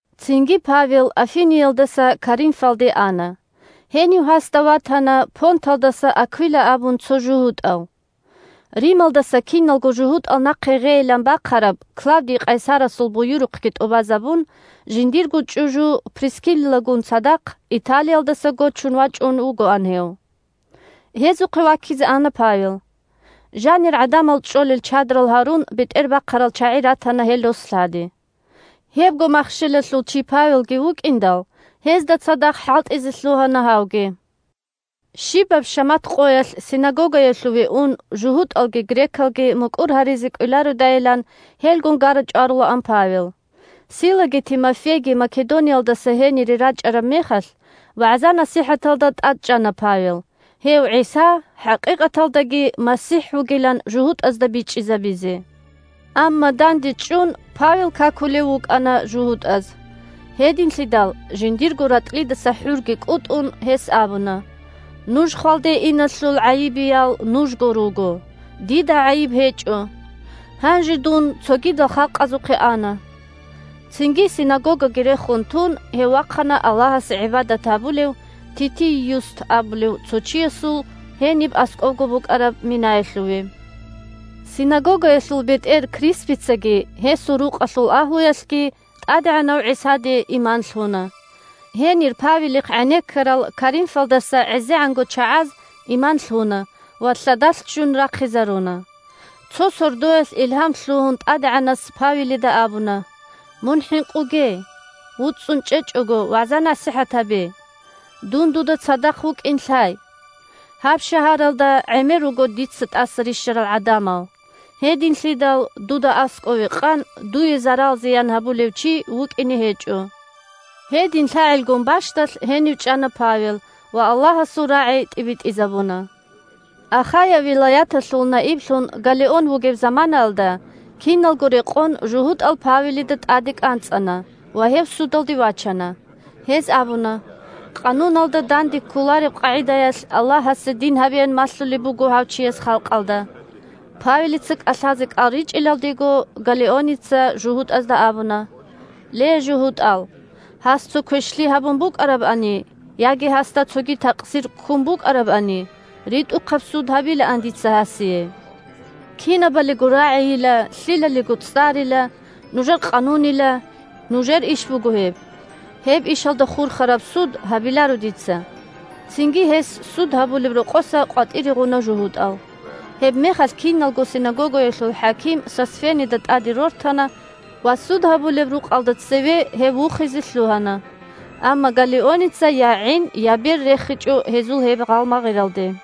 Цинги Павел Афиниялдаса Коринфалде ана. Гьенив гьасда ватана Понталдаса Аквила абун цо жугьутӀав. Рималдаса киналго жугьутӀал нахъе гъейилан бахъараб Клавдий къайсарасул буюрухъги тӀубазабун, жиндирго чӀужу Прискиллагун цадахъ Италиялдаса гочун вачӀун вугоан гьев. Гьезухъе ваккизе ана Павел. Жанир гӀадамал чӀолел чадрал гьарун бетӀербахъарал чагӀи ратана гьел рос-лъади. Гьебго махщелалъул чи Павелги вукӀиндал, гьезда цадахъ хӀалтӀизе лъугьана гьавги. Щибаб шамат къоялъ синагогаялъуве ун, жугьутӀалги грекалги мукӀур гьаризе кӀвелародайилан, гьелгун гара-чӀварулаан Павел. Силаги Тимофейги Македониялдаса гьенире рачӀараб мехалъ, вагӀза-насихӀаталда тӀадчӀана Павел, гьев ГӀиса хӀакъикъаталдаги МасихӀ вугилан жугьутӀазда бичӀчӀизабизе. Амма, дандечӀун, Павел какулев вукӀана жугьутӀаз. Гьединлъидал, жиндирго ратӀлидаса хӀурги кӀутӀун, гьес абуна: – Нуж хвалде иналъул гӀайибиял нужго руго. Дида гӀайиб гьечӀо. Гьанже дун цогидал халкъазухъе ана. Цинги синагогаги рехун тун, гьев вахъана Аллагьасе гӀибадат гьабулев Титий Юст абулев цо чиясул гьениб аскӀобго букӀараб минаялъуве. Синагогаялъул бетӀер Криспицаги гьесул рукъалъул агьлуялъги ТӀадегӀанав ГӀисаде иман лъуна. Гьенир Павелихъ гӀенеккарал Коринфалдаса гӀезегӀанго чагӀаз иман лъуна ва лъадалъ ччун рахъизаруна. Цо сордоялъ илгьам лъугьун ТӀадегӀанас Павелида абуна: – Мун хӀинкъуге! ВуцӀцӀун чӀечӀого, вагӀза-насихӀат гьабе. Дун дуда цадахъ вукӀин лъай. Гьаб шагьаралда гӀемер руго дица тӀаса рищарал гӀадамал. Гьединлъидал дуда аскӀове къан, дуе зарал-зиян гьабулев чи вукӀине гьечӀо. Гьедин лъагӀелгун бащдалъ гьенив чӀана Павел ва Аллагьасул рагӀи тӀибитӀизабуна. Ахая вилаяталъул наиблъун Галлион вугеб заманаялда, киналго рекъон жугьутӀал Павелида тӀаде кӀанцӀана ва гьев судалде вачана. Гьез абуна: – Къануналда данде кколареб къагӀидаялъ Аллагьасе дин гьабеян малъулеб буго гьав чияс халкъалда. Павелица кӀалъазе кӀал ричӀилалдего, Галлионица жугьутӀазда абуна: – Ле, жугьутӀал, гьас цо квешлъи гьабун букӀарабани яги гьасда цоги такъсир ккун букӀарабани, ритӀухъаб суд гьабилаан дица гьасие. Кинабалиго рагӀийила, лъилалиго цӀарила, нужер къанунила, – нужер иш буго гьеб. Гьеб ишалда хурхараб суд гьабиларо дица. Цинги гьес суд гьабулеб рокъоса къватӀире гъуна жугьутӀал. Гьебмехалъ киналго синагогаялъул хӀаким Сосфенида тӀаде рортана ва суд гьабулеб рукъалда цеве гьев вухизе лъугьана. Амма Галлионица я гӀин, я бер рехичӀо гьезул гьеб гъалмагъиралде.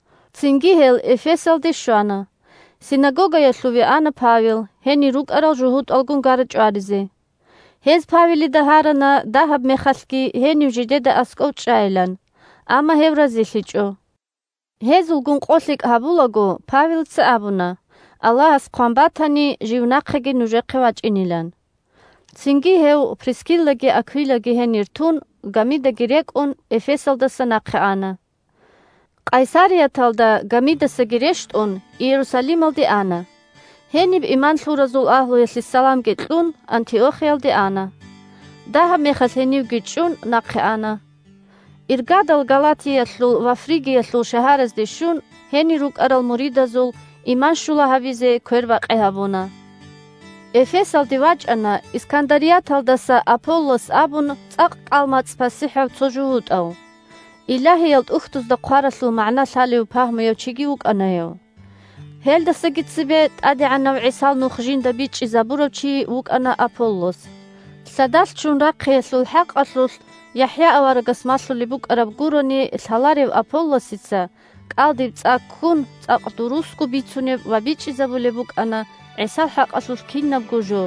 Цинги гьел Эфесалде щвана. Синагогаялъуве ана Павел, гьенир рукӀарал жугьутӀалгун гара-чӀваризе. Гьез Павелида гьарана дагьаб мехалъги гьенив жидеда аскӀов чӀайилан, амма гьев разилъичӀо. Гьезулгун къолъикӀ гьабулаго, Павелица абуна, Аллагьас хъван батани, жив нахъеги нужехъе вачӀинилан. Цинги гьев, Прискиллаги Аквилаги гьенир тун, гамидаги рекӀун, Эфесалдаса нахъе ана. Къайсарияталда гамидасаги рещтӀун, Иерусалималде ана. Гьениб иман лъуразул агьлуялъе саламги кьун, Антиохиялде ана. Дагьаб мехалъ гьенивги чӀун, нахъе ана. Иргадал Галатиялъул ва Фригиялъул шагьаразде щун, гьенир рукӀарал муридазул иман щула гьабизе квербакъи гьабуна. Эфесалде вачӀана Искандарияталдаса Аполлос абун цӀакъ кӀал-мацӀ пасихӀав цо жугьутӀав. Илагьиял ТӀухьдузда хъваралъул магӀна лъалев пагьмуяв чиги вукӀана гьев. Гьелдасаги цебе ТӀадегӀанав ГӀисал Нух жинда бичӀчӀизабурав чи вукӀана Аполлос. Лъадалъ ччун рахъиялъул хӀакъалъулъ ЯхӀя аварагас малъулеб букӀараб гурони лъаларев Аполлосица, кӀалдиб цӀа ккун, цӀакъ дурусго бицунеб ва бичӀчӀизабулеб букӀана ГӀисал хӀакъалъулъ кинабго жо.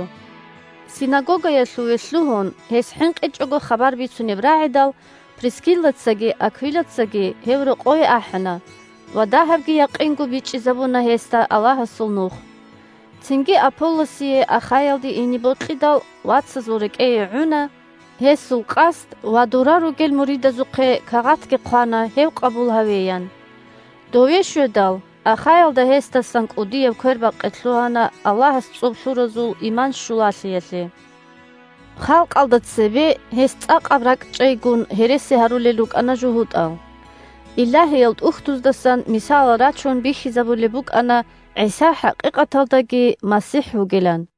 Синагогаялъуве лъугьун, гьес хӀинкъичӀого хабар бицунеб рагӀидал, Прискиллацаги Аквилацаги гьев рокъове ахӀана ва дагьабги якъинго бичӀчӀизабуна гьесда Аллагьасул Нух. Цинги Аполлосие Ахаялде ине бокьидал, вацазул рекӀее гӀуна гьесул къасд ва дора ругел муридазухъе кагъатги хъвана гьев къабул гьавеян. Дове щведал, Ахаялда гьесдасан кӀудияб квербакъи лъугьана Аллагьас цӀоб лъуразул иман щулалъиялъе. Халкъалда цебе гьес цӀакъаб ракӀчӀейгун гьереси гьарулел рукӀана жугьутӀал. Илагьиял ТӀухьдуздасан мисалал рачун бихьизабулеб букӀана ГӀиса хӀакъикъаталдаги МасихӀ вугилан.